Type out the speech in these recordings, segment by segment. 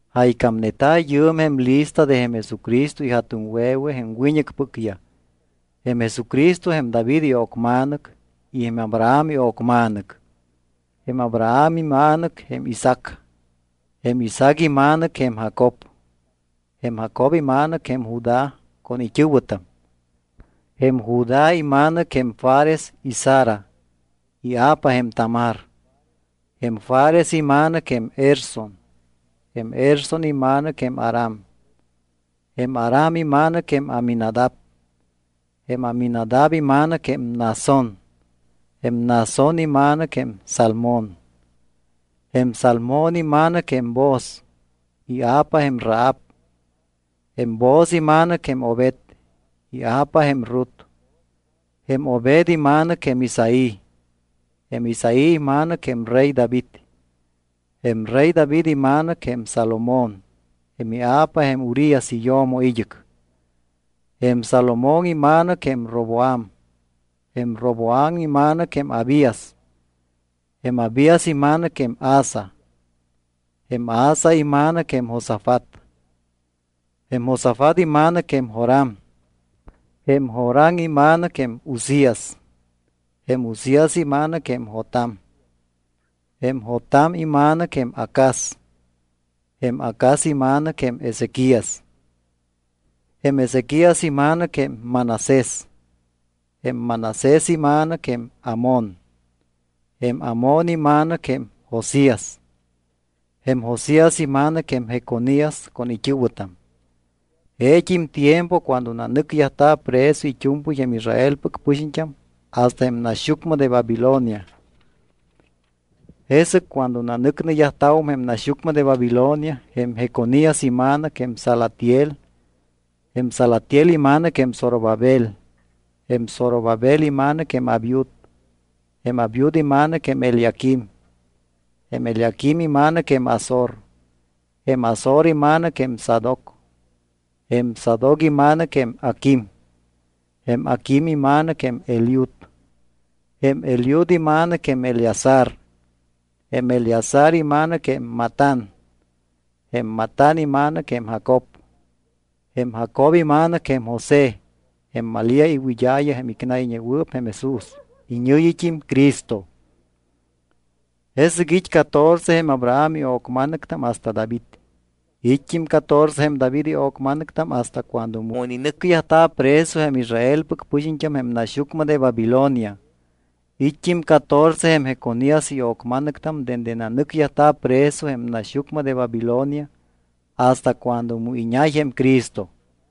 Jaycámneta̱ yɨɨm jém lista de jém Jesucristo ija̱tuŋwe̱we jém wiñɨcpɨcyaj. Jém Jesucristo jém David io̱cma̱nɨc y jém Abraham io̱cma̱nɨc. Jém Abraham ima̱nɨc jém Isaac. Jém Isaac ima̱nɨc jém Jacob. Jém Jacob ima̱nɨc jém Judá con it́ɨ̱wɨtam. Jém Judá ima̱nɨc jém Fares y Zara, ia̱pa jém Tamar. Jém Fares ima̱nɨc jém Erson. Jém Erson ima̱nɨc jém Aram. Jém Aram ima̱nɨc jém Aminadab. Jém Aminadab ima̱nɨc jém Naasón. Jém Naasón ima̱nɨc jém Salmón. Jém Salmón ima̱nɨc jém Booz, ia̱pa jém Rahab. Jém Booz ima̱nɨc jém Obed, ia̱pa jém Rut. Jém Obed ima̱nɨc jém Isaí. Jém Isaí ima̱nɨc jém rey David. Jém rey David ima̱nɨc jém Salomón, jém ia̱pa jém Urías iyo̱mo id́ɨc. Jém Salomón ima̱nɨc jém Roboam. Jém Roboam ima̱nɨc jém Abías. Jém Abías ima̱nɨc jém Asa. Jém Asa ima̱nɨc jém Josafat. Jém Josafat ima̱nɨc jém Joram. Jém Joram ima̱nɨc jém Uzías. Jém Uzías ima̱nɨc jém Jotam. Jém Jotam ima̱nɨc jém Acaz. Jém Acaz ima̱nɨc jém Ezequías. Jém Ezequías ima̱nɨc jém Manasés. Jém Manasés ima̱nɨc jém Amón. Jém Amón ima̱nɨc jém Josías. Jém Josías ima̱nɨc jém Jeconías con it́ɨ̱wɨtam. Jeet́im tiempo cuando nanɨcyajta̱ preso it́u̱mpɨy jém Israelpɨc pɨxiñt́am hasta jém naxyucmɨ de Babilonia. Jesɨc cuando nanɨcneyajta̱wum jém naxyucmɨ de Babilonia jém Jeconías ima̱nɨc jém Salatiel. Jém Salatiel ima̱nɨc jém Zorobabel. Jém Zorobabel ima̱nɨc jém Abiud. Jém Abiud ima̱nɨc jém Eliaquim. Jém Eliaquim ima̱nɨc jém Azor. Jém Azor ima̱nɨc jém Sadoc. Jém Sadoc ima̱nɨc jém Aquim. Jém Aquim ima̱nɨc jém Eliud. Jém Eliud ima̱nɨc jém Eleazar. Jém Eleazar ima̱nɨc jém Matán. Jém Matán ima̱nɨc jém Jacob. Jém Jacob ima̱nɨc jém José, jém Malía iwɨd́a̱ya jém icnayñewɨɨp jém Jesús, iñɨ̱yit́im CRISTO. Jesɨc it́ catorce jém Abraham io̱cma̱nɨctam hasta David. It́t́im catorce jém David io̱cma̱nɨctam hasta cuando mu ininɨcyajta̱ preso jém Israelpɨc pɨxiñt́am jém naxyucmɨ de Babilonia. It́t́im catorce jém Jeconías io̱cma̱nɨctam dende nanɨcyajta̱ preso jém naxyucmɨ de Babilonia hasta cuando mu iñay jém Cristo.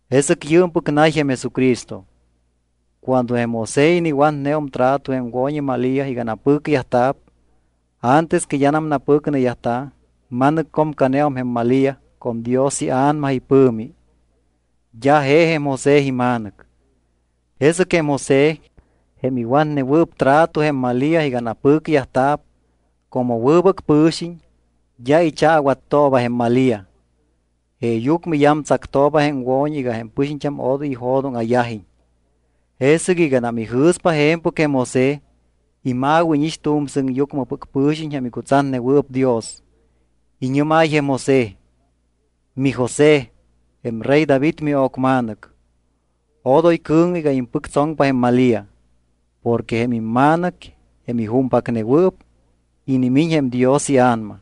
Jesɨc yɨɨmpɨc nay jém Jesucristo. Cuando jém José iniwatneum trato jém wo̱ñi Malía iga napɨcyajta̱p, antes que d́anam napɨcneyajta̱, ma̱nɨccomcaneum jém Malía con Dios iA̱nama ipɨ̱mi. D́a je jém José ima̱nɨc. Jesɨc jém José, jém iwatnewɨɨp trato jém Malía iga napɨcyajta̱p, como wɨbɨc pɨ̱xiñ, d́a ichaawattooba jém Malía. Jeeyucmɨ iyamtsactooba jém wo̱ñi iga jém pɨxiñt́am odoy ijo̱dóŋa̱yajiñ. Jesɨc iganam ijɨ̱spa je̱mpɨc jém José, ima̱wíñix tu̱m sɨŋyucmɨpɨc pɨ̱xiñ jém icutsatnewɨɨp Dios. Iñɨ́máy jém José: —MiJosé, jém rey David mio̱cma̱nɨc, odoy cɨ̱ŋɨ iga impɨctsoŋpa jém Malía. Porque jém ima̱nɨc, jém ijúmpacnewɨɨp, inimiñ jém Dios iA̱nama.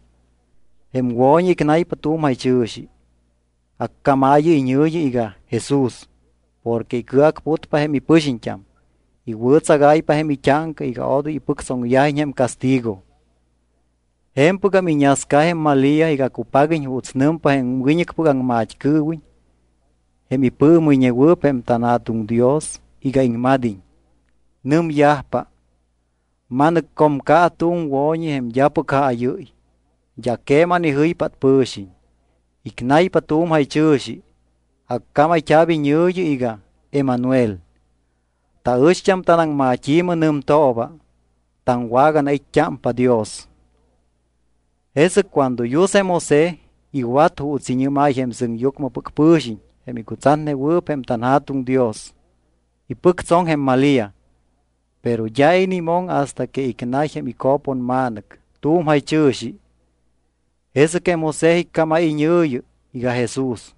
Jém wo̱ñi icnaypa tu̱m jaychɨ̱xi. Accámaayɨ iñɨ̱yi iga JESÚS porque icɨacputpa jém ipɨxiñt́am, iwɨ̱tsagáypa jém it́áŋca iga odoy ipɨctsoŋyajiñ jém castigo. Je̱mpɨgam iñasca jém Malía iga cupaguiñ juuts nɨmpa jém wiñɨcpɨc aŋmat́cɨɨwiñ jém ipɨɨmɨyñewɨɨp jém tanJa̱tuŋ Dios iga iŋmad́iñ. Nɨmyajpa: Ma̱nɨccomca tu̱m wo̱ñi jém d́apɨc jaayɨ́y. D́a queman ijɨypát pɨ̱xiñ. Icnaypa tu̱m jaychɨ̱xi. Accámayt́a̱p iñɨ̱yi iga Emanuel. Taɨcht́am tanaŋmat́i̱mɨ nɨmtooba: taŋwaganait́t́ámpa Dios. Jesɨc cuando yus jém José iwat juuts iñɨ́máy jém sɨŋyucmɨpɨc pɨ̱xiñ jém icutsatnewɨɨp jém tanJa̱tuŋ Dios. Ipɨctsoŋ jém Malía. Pero d́a inimoŋ hasta que icnay jém ico̱ponma̱nɨc tu̱m jaychɨ̱xi. Jesɨc jém José iccámáy iñɨ̱yi iga Jesús.